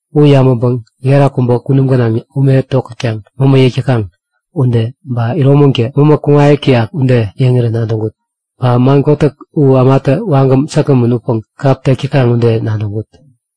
U yabäŋpäŋ gera kubä kunum gänaŋ ume tokätkaŋ mämä yäk täkaŋ ude, ba iromäŋtä mämä kuŋayäk täyak ude yäŋirän nadäŋkut. Ba man kotäk u ämatä wagäm säkgämän utpäŋ kap tek täkaŋ ude nadäŋkut.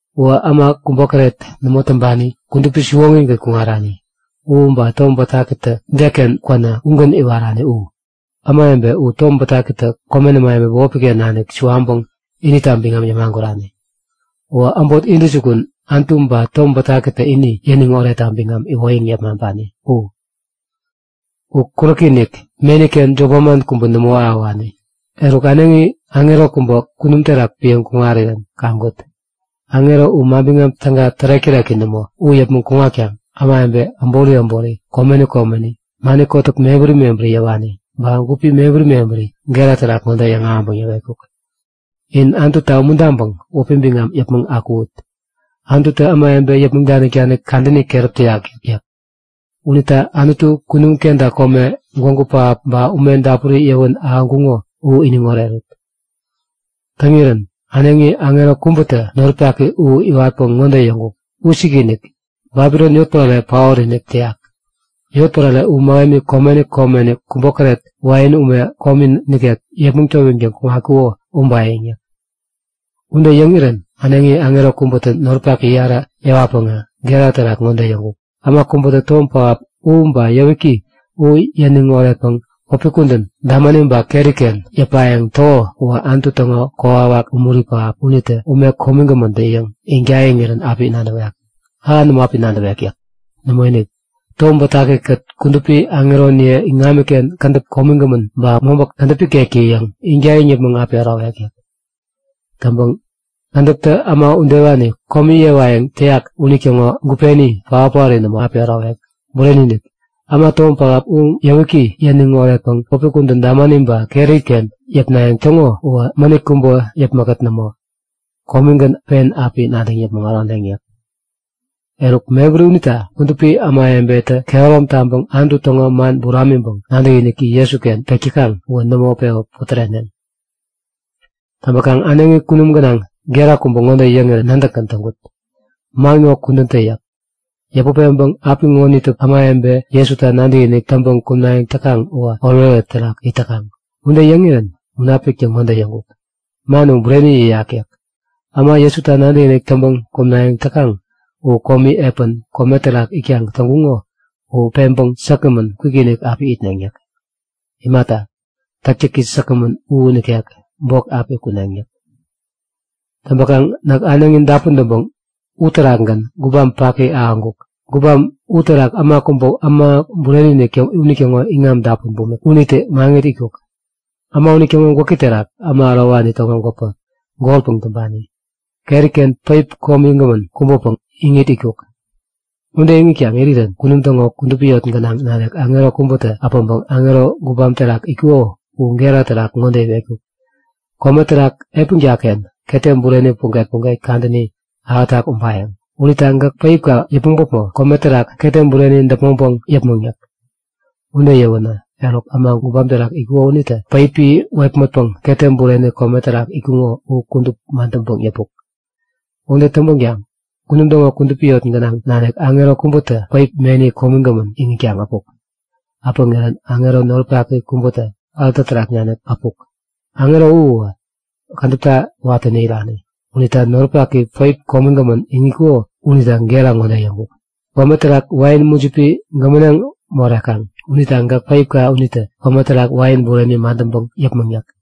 Uwä äma kubokäret nämo täŋpani, kudupi siwoŋigän kuŋarani u, ba Tom Bätakitä deken kwänä ugän iwarani u. Ämawebe u Tom Bätakitä komen ämawebe bämopi-ken nanik suwaŋpäŋ inita biŋam yämagurani. Uwä äbot intäjukun Anutu ba Tom Bätakitä ini yäniŋ oretta biŋam iwoyäŋ yepmaŋpani u. U kuräki-inik, meni-ken jop manman kubä nämo ahäwani. Eruk äneŋi aŋero kubä kunum terak piäŋ kuŋirän kaŋkut. Aŋero u Manbiŋam Täga tärek-täreki nämo u yäpmäŋ kuŋatkaŋ ämawebe äbori äbori, komeni komeni, mani kotäk mebäri mebäri yäwani ba gupi mebäri mebäri gera terak ŋode yäŋahäŋpäŋ yäwetkuk; In Anututa umuntaŋpäŋ wäpi biŋam yäpmäŋ akuwut! Anututä ämawebe yäpmäŋ danik-danik kadäni keräp täyak yäk. Unita Anutu kunum kenta kome, gwägu pähap ba ume dapuri yäwän ahäŋkuŋo u iniŋ orerut! Täŋirän äneŋi aŋero kubätä noripaki u iwatpäŋ ŋode yäŋkuk; Wisikinik! Babilon yotpärare paot-inik täyak. Yotpärare u mähemi komeni komeni kubokäret wain ume komi nikek yepmäŋ towiŋtäŋ kuŋatkuko ubayäŋ yäk. Ude yäŋirän äneŋi aŋero kubätä noripak yarä yäwatpäŋä gera terak ŋode yäŋkuk; Äma kubätä tom pähap u ba yäwiki u yäniŋ oretpäŋ wäpi kudän damani ba keri-ken yäpayäŋ täko uwä Anutu täŋo kokwawaki umuri pähap unitä, ume komigämäntä-yäŋ iŋtäyiŋirän api nadäwek. Ähan nämo api nadäwek yäk. Nämoinik, Tom Bätaki-kät kudupi aŋeroniye iŋamiken kädäp komigämän ba mobä kädäp ikektä-yäŋ iŋtäyiŋ yäpmäŋ api ärowek yäk. Täŋpäŋ kädäptä äma udewani komi yewayäŋ täyak unitäŋo gupeni paot-paori nämo api ärowek. Bureni-inik, äma tom pähap u ba yäwiki yäniŋ oretpäŋ wäpi kudän damani ba keri-ken yäpnayäŋ täŋo uwä mänit kubä yäpmäkkät nämo, komigän pen api nadäŋ yäpmäŋ äroneŋ yäk. Eruk mebäri unita kudupi ämawebetä kehärom taŋpäŋ Anutu täŋo man buramiŋpäŋ nadäkiniki Jesuken pek täkaŋ uwä nämo pewä putäreneŋ. Täŋpäkaŋ äneŋi kunum gänaŋ gera kubä ŋode yäŋirän nadäkgän täŋkut; Man ŋo kudän tä yäk. Yäput peŋpäŋ apiŋonitä ämawebe Jesuta nadäkinik täŋpäŋ kumnayäŋ täkaŋ uwä oretoret terak it täkaŋ. Ude yäŋirän Munapiktä ŋode yäŋkuk; Man u bureni yäyak yäk. Äma Jesuta nadäkinik täŋpäŋ kumnayäŋ täkaŋ u komi epän kome terak itkaŋ täŋkuŋo u peŋpäŋ säkgämän kwikinik api itneŋ yäk. Imata, täktäki säkgämän u nikek bok api kuneŋ yäk. Täŋpäkaŋ näk äneŋi dapun täŋira uterakgän gubam paki ahäŋkuk. Gubam uterak äma kubä Äma Bureni-inik unitäŋo iŋam dapun bumik unitä maŋit itkuk. Äma unitäŋo gwäki terak äma ärowani täŋo gwäpä, golpäŋ täŋpani. Keriken päip komigämän kubäpäŋ iŋit itkuk. Ude iŋitkaŋ irirän kunum täŋo kudupi yot gänaŋ nanik aŋero kubätä äpäŋpäŋ aŋero gubam terak itkuko u gera terak ŋode iwetkuk; Kome terak epänka-ken ketem bureni puget-puget kadäni ahätak ubayäŋ. Unita gäk päipka yäpmäŋ päpmo kome terak ketem bureni däpmäŋpäŋ yäpmäŋ yäk. Ude yäwänä, eruk äma gubam terak itkuko unitä päipi wepmätpäŋ ketem bureni kome terak itkuŋo u kudup madäŋpäŋ yäpuk. Ude täŋpänkaŋ kunum täŋo kudupi yot gänaŋ nanik aŋero kubätä päip, meni komigämän iŋitkaŋ äpuk. Äpäŋirän aŋero noripaki kubätä alta terak naniktä äpuk. Aŋero u uwä kädäpta watäni irani. Unitä noripaki päip komigämän iŋitkuko unita gera ŋode yäŋkuk; Kome terak wain mujipi gämäneŋ morekaŋ. Unita gäk päipka unitä kome terak wain bureni madäŋpäŋ yäpmäŋ yäk.